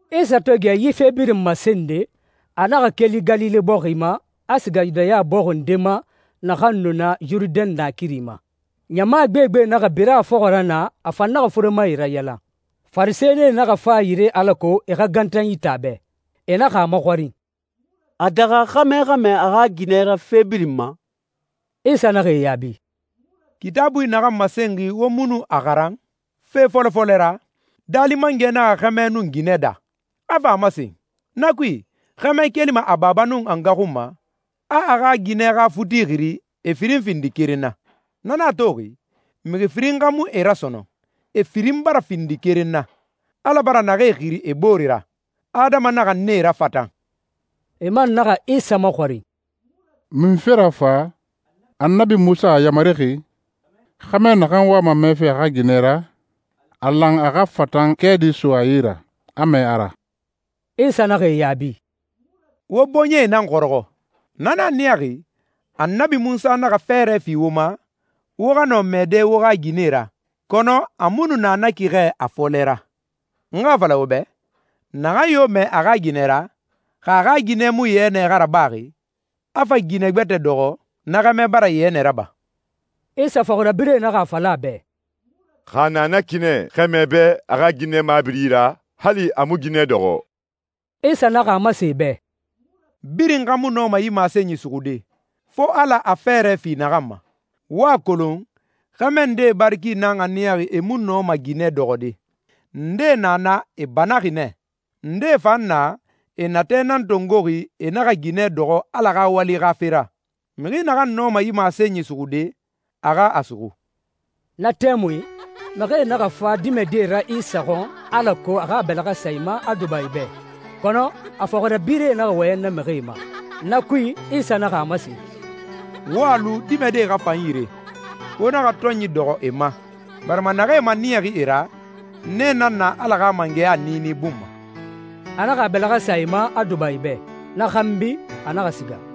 Isa to gɛ yi fe birin masende, a naxa keli Galile bɔxi ma, a siga Yudaya bɔxi nde ma naxan nu na Yurudɛn naakiri ma. Ɲama gbegbe naxa bira a fɔxɔ ra naa, a fan naxa furemae rayalan. Farisɛnie naxa fa a yire alako e xa gantanyi te a bɛ. E naxa a maxɔrin, «A daxa xɛmɛ xa mɛɛ a xa ginɛ ra fe birin ma?» Isa naxa e yaabi, «Kitaabui naxan masenxi wo mu nu a xaran? Fe fɔlɔ fɔlɛ ra, Daali Mangɛ naxa xɛmɛ nun ginɛ daa, a fa a masen, ‹Na kui, xɛmɛ kelima a baba nun a nga xun ma, a a xa ginɛ xa futi xiri, e firin findi keren na.› Na nan a toxi, mixi firin xa mu e ra sɔnɔn, e firin bara findi keren na. Ala bara naxee xiri e boore ra, adama naxa nee rafatan.» E man naxa Isa maxɔrin, «Munfe ra fa Annabi Munsa a yamarixi, xɛmɛ naxan wama mɛɛfe a xa ginɛ ra, a lan a xa fatan kɛɛdi so a yi ra, a mɛɛ a ra?» Isa naxa e yaabi, «Wo bɔɲɛe nan xɔrɔxɔ, na nan a niyaxi Annabi Munsa naxa fɛɛrɛ fi wo ma, wo xa nɔ mɛɛde wo xa ginɛe ra, kɔnɔ a mu nu na na ki xɛ a fɔlɛ ra. N xa a fala wo bɛ, naxan yo mɛɛ a xa ginɛ ra, xa a xa ginɛ mu yɛnɛ xa rabaxi, a fa ginɛ gbɛtɛ dɔxɔ, na xɛmɛ bara yɛnɛ raba.» Isa fɔxirabirɛe naxa a fala a bɛ, «Xa a na na ki nɛ xɛmɛ bɛ a xa ginɛ mabiri ra, hali a mu ginɛ dɔxɔ.» Isa naxa a masen e bɛ, «Birin xa mu nɔma yi masenyi suxude, fo Ala a fɛɛrɛ fi naxan ma. Wo a kolon, xɛmɛ ndee bari ki nan a niyaxi e mu nɔma ginɛ dɔxɔde. Ndee na na e e banaxi nɛ. Ndee fan na, e natɛ nan tongoxi e naxa ginɛ dɔxɔ Ala xa wali xa fe ra. Mixi naxan nɔma yi masenyi suxude, a xa a suxu.» Na tɛmui mixie naxa fa dimɛdie ra Isa xɔn, alako a xa a bɛlɛxɛ sa e ma, a duba e bɛ. Kɔnɔ a fɔxirabirɛe naxa wɔyɛn na mixie ma. Na kui, Isa naxa a masen, «Wo a lu dimɛdie xa fa n yire. Wo naxa tɔnyi dɔxɔ e ma, barima naxee maniyaxi e ra, nee nan na Ala xa mangɛya niini bun ma.» A naxa a bɛlɛxɛ sa e ma, a duba e bɛ. Na xanbi, a naxa siga.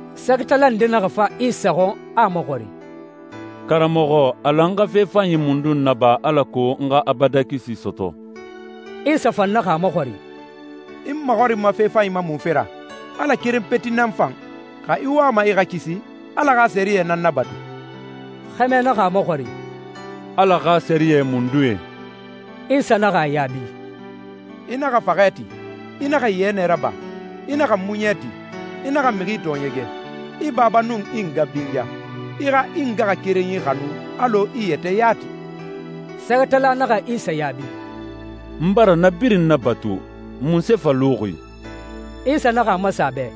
Sɛgɛtala nde naxa fa Isa xɔn, a a maxɔrin, «Karamɔxɔ, a lan n xa fe fanyi mundun naba alako n xa abadan kisi sɔtɔ?» Isa fan naxa a maxɔrin, «I n maxɔrinma fe fanyi ma munfe ra? Ala keren peti nan fan. Xa i wama i xa kisi, Ala xa sɛriyɛ nan nabatu.» Xɛmɛ naxa a maxɔrin, «Ala xa sɛriyɛ mundue?» Isa naxa a yaabi, «I naxa faxɛ ti. I naxa yɛnɛ raba. I naxa muɲɛ ti. I naxa mixi tɔɔɲɛgɛ. I baba nun i nga binya. I xa i ngaxakerenyi xanu alɔ i yɛtɛ yati.» Sɛgɛtala naxa Isa yaabi, «N bara na birin nabatu. Munse fa luxi?» Isa naxa a masen a bɛ,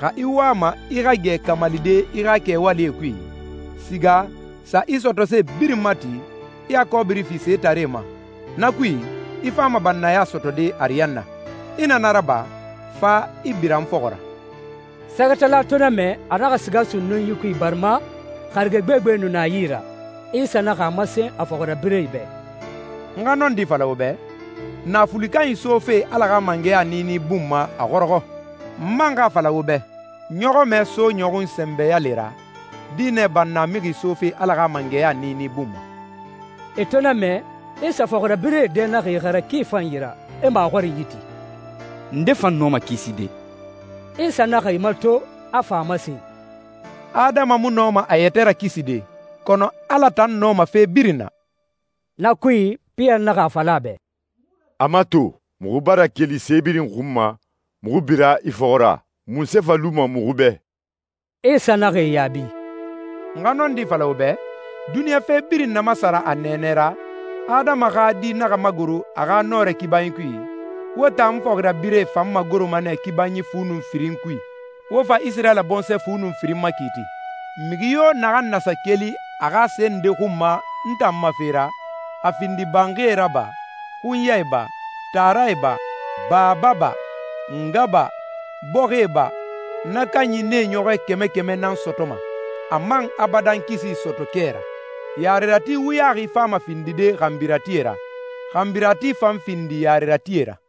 «Xa i wama i xa gɛ kamalide i xa kɛwalie kui, siga, sa i sɔtɔse birin mati, i a kɔbiri fi setaree ma. Na kui, i fama bannaya sɔtɔde ariyanna. I na na raba, fa, i bira n fɔxɔ ra.» Sɛgɛtala to na mɛ, a naxa siga sunnunyi kui, barima harige gbegbe nu na a yi ra. Isa naxa a masen a fɔxirabirɛe bɛ, «N xa nɔndi fala wo bɛ, naafuli kanyi sofe Ala xa mangɛya niini bun ma a xɔrɔxɔ. N man xa a fala wo bɛ, ɲɔxɔmɛ so ɲɔxun sɛnbɛ yale ra, dinɛ bannamixi sofe Ala xa mangɛya niini bun ma.» E to na mɛ, Isa fɔxirabirɛe dɛ naxa ixara ki fanyi ra, e maxɔrinyi ti, «Nde, fa nɔma kiside?» Isa naxa e mato, a fa a masen, «Adama mu nɔma a yɛtɛ rakiside, kɔnɔ Ala tan nɔma fe birin na.» Na kui, Piyɛri naxa a fala a bɛ, «A mato, muxu bara keli se birin xun ma, muxu bira i fɔxɔ ra. Munse fa luma muxu bɛ?» Isa naxa e yaabi, «N xa nɔndi fala wo bɛ, duniɲa fe birin na masara a nɛɛnɛ ra, Adama xa Di naxa magoro a xa nɔrɛ kibanyi kui, wo tan n fɔxirabirɛe fan magoroma nɛ kibanyi fu nun firin kui, wo fa Isirayila bɔnsɔɛ fu nun firin makiiti. Mixi yo naxan na sa keli a xa se nde xun ma n tan ma fe ra, a findi banxie ra ba, xunyae ba, taarae ba, baba ba, nga ba, bɔxie ba, na kanyi nee ɲɔxɔ kɛmɛ kɛmɛ nan sɔtɔma, a man abadan kisi sɔtɔ kɛ ra. Yarerati wuyaxi fama findide xanbiratie ra, xanbirati fan findi yareratie ra.»